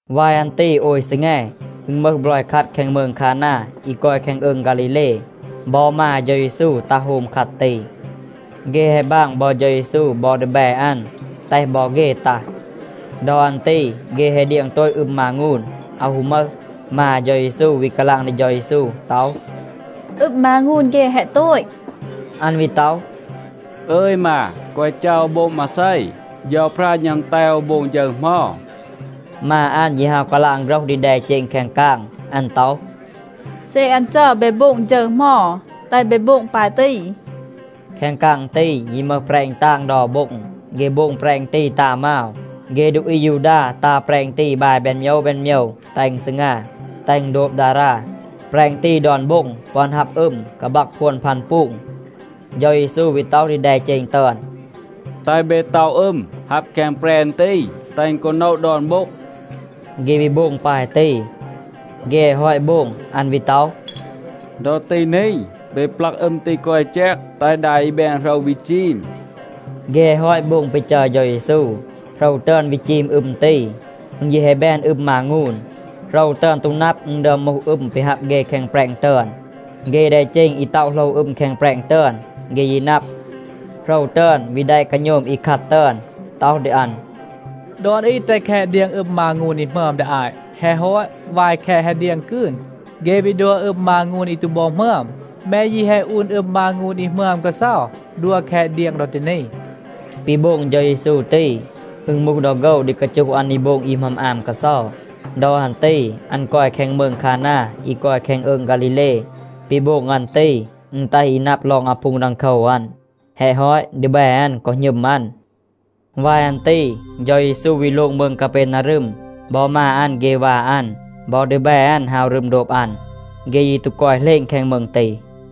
วาย อัน ตี โอย ซีแง, อึณ มึห บลอย คัด แคง มืง คานา อี กอย แคง อืง ฆาลีเล. บอ มา เฌา เยซู ตัห โฮม คัด ตี. เฆ แฮะ บาง บอ เฌา เยซู บอ ดีแบ อัน, แตห บอ เฆ ตัห. ดอ อัน ตี เฆ แฮะ เดียง โตต อึม มางูน, อาว ฮู มึห. มา เฌา เยซู วี กาลาง ดี เฌา เยซู ต็อห, “อึม มางูน เฆ แฮะ โตต.” อัน วี ต็อห, “อึย มา, แกวะ จัร โอว โบง มาเซ. เฌาพรา หณัม แตห โอว โบง ฌึร เหมา.” มา อัน ยี ฮาว กาลาง โฆรห ดี แดเจณ แคง กาง. อัน ต็อห, “เซ อัน จัร เบ โบง ฌึร เหมา, แตห เบ โบง ปาย ตี.” แคง กาง ตี ยี มึห แปรณ ตาง เดา โบ็ง. เฆ โบง แปรณ ตี ตา มาว. เฆ ดูอี อายูดา ตา แปรณ ตี บาย แบน โมยว แบน โมยว, แตห อึณ ซีงา, แตห อึณ โดบ ดารา. แปรณ ตี ดอน โบ็ง ปึอน ฮับ อึม กาบัก พวน พัน ปูง. เฌา เยซู วี ต็อห ดี แดเจณ ตึอน, “แตห เบ ต็อะ อึม, ฮับ แคง แปรณ ตี, แตห กอ โนะ ดอน โบ็ง.” เฆ วี โบง ปาย ตี. เฆ แฮะ ฮอต โบง, อัน วี ต็อห, “ดอ ตี นี, เบ ปลัก อึม ตี คอ อี แจก, แตห ดา อี แบน โหรว วี จีม.” เฆ แฮะ ฮอต โบง ปี จัร เฌา เยซู, โหรว ตึอน วี จีม อึม ตี. อึณ ยี แฮะ แบน อึม มางูน. โหรว ตึอน ตู นับ, อึณ ดึอม มูห อึม ปี ฮับ เฆ แคง แปรณ ตึอน. เฆ แดเจณ อี ต็อะ โหลว อึม แคง แปรณ ตึอน, เฆ ยี นับ. โหรว ตึอน วี แดะ กาโณม อี คัด ตึอน, ต็อห ดี อัน, “ดอน อี แตห แคต เดียง อึม มางูน อี หมึอม ดี อาต. แฮะ ฮอต, วาย แคต แฮะ เดียง กืน, เฆ วี ดัว อึม มางูน อี ตู บอ หมึอม. แม ยี แฮะ อูน อึม มางูน อี หมึอม กาเซา, ดัว แคต เดียง ดอ ตี นี.” ปี โบง เฌา เยซู ตี, อึณ มูห ดอ โฆว ดี กาจูห อัน ดี โบง อี หมึอม อาม กาเซา. ดอ อัน ตี อัน กอย แคง มืง คานา อี กอย แคง อืง ฆาลีเล. ปี โบง อัน ตี, อึณ แตห อี นับ ลอง อาพูง ดังโคว อัน. แฮะ ฮอต, ดีแบ อัน กอ หณึม อัน. วาย อัน ตี เฌา เยซู วี โลง มืง กาเปนารึม. บอ มา อัน เฆ วา อัน, บอ ดีแบ อัน ฮาว รึม โดบ อัน. เฆ ยี ตู กอย เหลณ แคง มืง ตี.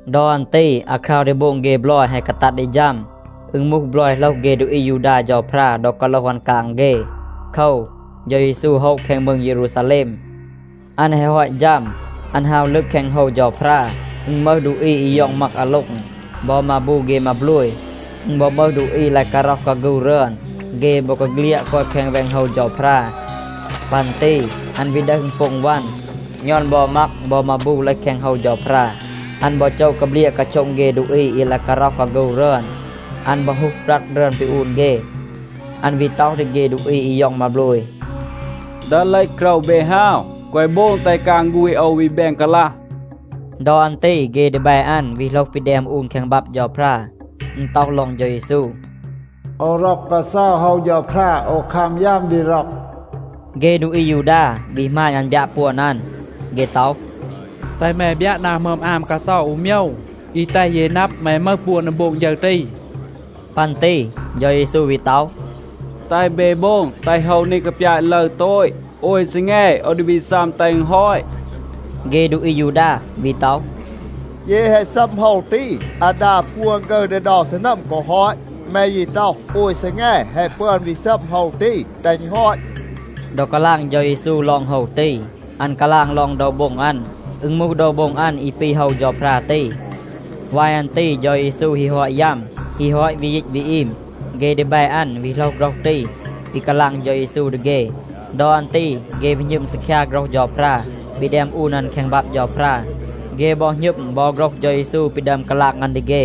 ดอ อัน ตี อาคราว ดี โบง เฆ บลอย แฮะ กาตัด ดี ฌัม. อึณ มูห บลอย โหลห เฆ ดูอี อายูดา เฌาพรา ดอ กาโลห อัน กาง เฆ. โคว, เฌา เยซู โฮะ แคง มืง เยรูซาแลม. อัน แฮะ ฮอต ฌัม, อัน ฮาว ลึบ แคง โฮว เฌาพรา. อึณ มึห ดูอี อี ย็อง มัก อาโล็ง บอ มาบู เฆ มาโบลย. อึณ บอ มึห ดูอี ลาย การ็อห กาฆู รึอน, เฆ บอกาเฆลียด กอย แคง แวง โฮว เฌาพรา. ปัน ตี อัน วี ดึห อึณโป็ง วัน, ณอน บอ มัก บอ มาบู เลห แคง โฮว เฌาพรา. อัน บอ โจะ กาเบลียะ กาโช็ง เฆ ดูอี อี ลาย การ็อห กาฆู รึอน. อัน บอ ฮูห บรัด รึอน ปี อูน เฆ. อัน วี ต็อห ดี เฆ ดูอี อี ย็อง มาโบลย, “ดึห เลห โกรว เบ ฮาว, แกวะ โบง แตห กาง ฆูณ โอว วี แบน กาลัห.” ดอ อัน ตี เฆ ดีแบ อัน วี โหลห ปี แดม อูน แคง บับ เฌาพรา. อึณ ต็อห ลอง เฌา เยซู, “โอว ร็อก กาเซา โฮว เฌาพรา. โอว คัม ยัม ดี ร็อก.” เฆ ดูอี อายูดา วี หมาณ อัน บยัะ ปวน อัน. เฆ ต็อห, “แตห แม บยัะ นา หมึอม อาม กาเซา อู โมยว อี แตห เย นับ แม มึห ปวน ดี โบง ฌึร ตี.” ปัน ตี เฌา เยซู วี ต็อห, “แตห เบ โบง แตห โฮว นี กาปยาต ลึร โตต. โอย ซีแง โอว ดี วี ซัม แตห อึณ ฮอต.” เฆ ดูอี อายูดา วี ต็อห, “เย แฮะ ซัม โฮว ตี, อาดา พวน ฆึร ดี เดา ซีนัม กอ ฮอต. แม ยี ต็อห, ‘โอย ซีแง แฮะ ปึอน วี ซัม โฮว ตี, แตห อึณ ฮอต.’” ดอ กาลาง เฌา เยซู ลอง โฮว ตี, อัน กาลาง ลอง โดว โบ็ง อัน. อึณ มูห โดว โบ็ง อัน อี ปี โฮว เฌาพรา ตี. วาย อัน ตี เฌา เยซู ฮี ฮอต ยัม, ฮี ฮอต วี ยีต วี อีม, เฆ ดีแบ อัน วี โหลห โฆรห ตี ปี กาลาง เฌา เยซู ดี เฆ. ดอ อัน ตี เฆ วี หณึม ซีคยา โฆรห เฌาพรา ปี แดม อูน อัน แคง บับ เฌาพรา. เฆ บอ หณึม บอ โฆรห เฌา เยซู ปี ดึอม กาลาง อัน ดี เฆ.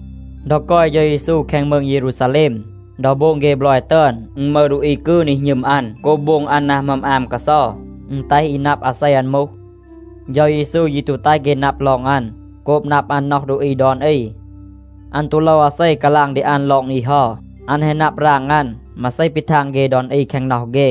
ดอ กอย เฌา เยซู แคง มืง เยรูซาแลม, ดอ โบง เฆ บลอย ตึอน, อึณ มึห ดูอี กืน อี หณึม อัน โกบ โบง อัน นา หมึอม อาม กาเซา. อึณ แตห อี นับ อาเซ อัน มูห. เฌา เยซู ยี ตู แตห เฆ นับ น็อห อัน โกบ นับ อัน น็อห ดูอี ดอน อี. อัน ตู โลว อาเซ กาลาง ดี อัน ลอง อี เฮา. อัน แฮะ นับ ราง อัน มาเซ ปี ทาง เฆ ดอน อี แคง น็อห เฆ.